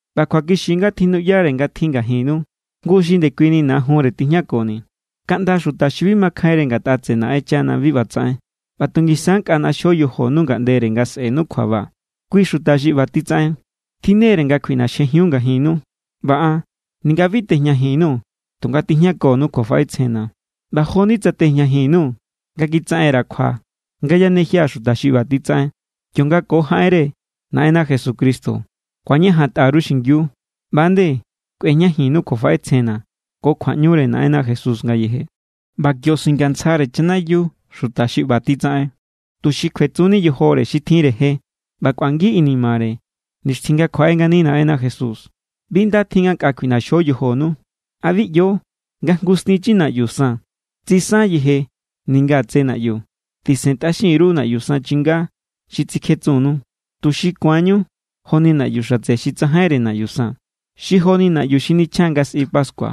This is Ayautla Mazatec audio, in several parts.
ꞌBa kjuakixi= nga tjinuꞌyare nga tjin ngajinnu jngu xi ndekuini najunre tijñakoni. Kaꞌnda xuta xi bi makjainre ngatꞌa tseꞌe Naꞌenchana bi ꞌba tsaꞌen. ꞌBa tu ngisa= nkꞌa ꞌnaxjo yojonu ngaꞌndere nga sꞌe̱nu kjuaba. Kui xuta xi ꞌba titsaꞌen tjinnere nga kjuiꞌnaxjejiun ngajinnu. ꞌBa an, ninga bi tejñajin_nuu̱, tunga tijñakonu kjuafaꞌetsjenna̱. ꞌBa jo=ni tsa tejñajin_nuu̱, nga kitsaꞌen_ra̱ kjua nga yanejia̱ xuta xi ꞌba titsaꞌen. Kionga ko jaꞌenre Naꞌenna Jesucristo ku̱añajantꞌa_ru xingiu, ꞌba=nde kꞌuejñajinnu kjuafaꞌetsjenna̱ ko kjuaꞌñure Naꞌenna Jesús ngayeje. ꞌBa kio singantsjare chanayiu xuta xi ꞌba titsaꞌen, tuxi kjuetsunni yojore xi tjinre je ꞌba kꞌuangi inimare nixtjin nga kjuaꞌe ngani Naꞌenna Jesús. Bi nda tjin nga nkꞌa kjuiꞌnaxjo yojonu. ¿A bi ꞌyo nga jngu stinchi naꞌyu san tsisan yeje ninga tse naꞌyu? Tisentꞌaxin_ru naꞌyu san chinga xi titsikjetsunnu, tuxi ku̱anñu joni naꞌyu xatse xi tsajainre naꞌyu san, xi joni naꞌyu xi nichjan nga sꞌi pascua.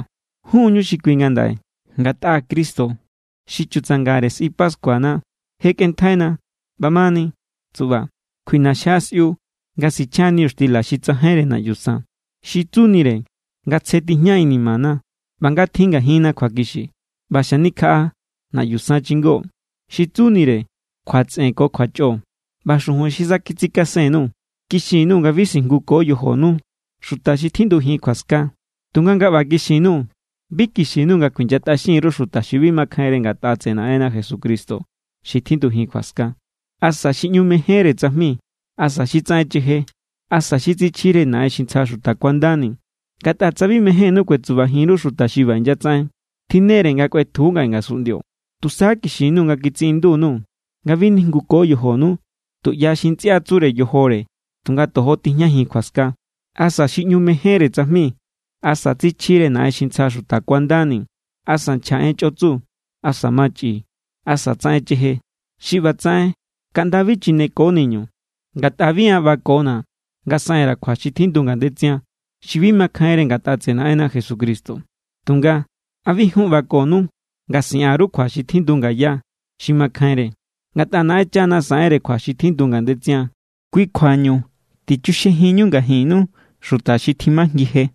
Jun=ñu xi kui ngandaꞌe, ngatꞌa Cristo xi chutsangare sꞌi pascuana je kꞌenntjaina. ꞌBamani tsuꞌba, kjuiꞌnaxjia sꞌiu nga sichjan niñuxtila xi tsajainre naꞌyu san. Xi tsunire nga tsje tijña inimana ꞌba nga tjin ngajinna kjuakixi. ꞌBa xanikjaꞌa naꞌyu san chingó, xi tsunire kjuatsꞌen ko kjuachꞌo. ꞌBa xujun xi sa kitsikasen_nuu̱ kixin_nuu̱ nga bi sijnguko yojonu xuta xi tjindujin kjuaska. Tunga nga ꞌba kixin_nuu̱, bi kixin_nuu̱ nga kuinyatꞌaxinkjin_ru xuta xi bi makjainre ngatꞌa tseꞌe Naꞌenna Jesucristo xi tjindujin kjuaska, asa xi ꞌñu mejénre tsajmi, asa xi tsaꞌen cheje, asa xi tsichjire naꞌen xi ntsja xuta kuandani. Ngatꞌa tsa bi mejénnú kuetsubajin_ru xuta xi ꞌba inyatsaꞌen, tjinne=re nga kꞌuetju ngaꞌe ngasunꞌndio. Tusa kixin_nuu̱ nga kitsiꞌindu_nuu̱ nga bi nijnguko yojonu tuꞌya xi ntsꞌia tsure yojore tunga tojo tijñajin kjuaska, asa xi ꞌñu mejénre tsajmi, asa tsichjire naꞌen xi ntsja xuta kuandani, asa nchja en chꞌotsu, asa machꞌi, asa tsaꞌen cheje. Xi ꞌba tsaꞌen kaꞌnda bi chineko niñu. Ngatꞌa bi an ꞌbakona̱ nga saꞌen_ra̱ kjua xi tjindu ngandetsian, xi bi makjainre ngatꞌa tseꞌe Naꞌenna Jesucristo. Tunga ¿a bi jun ꞌbakonu nga siꞌan_ru kjua xi tjindu ngaya, xi makjainre? Ngatꞌa Naꞌenchana saꞌenre kjua xi tjindu ngandetsian. Kui kjuañu tichuxjejinñu ngajinnu xuta xi timajngi je.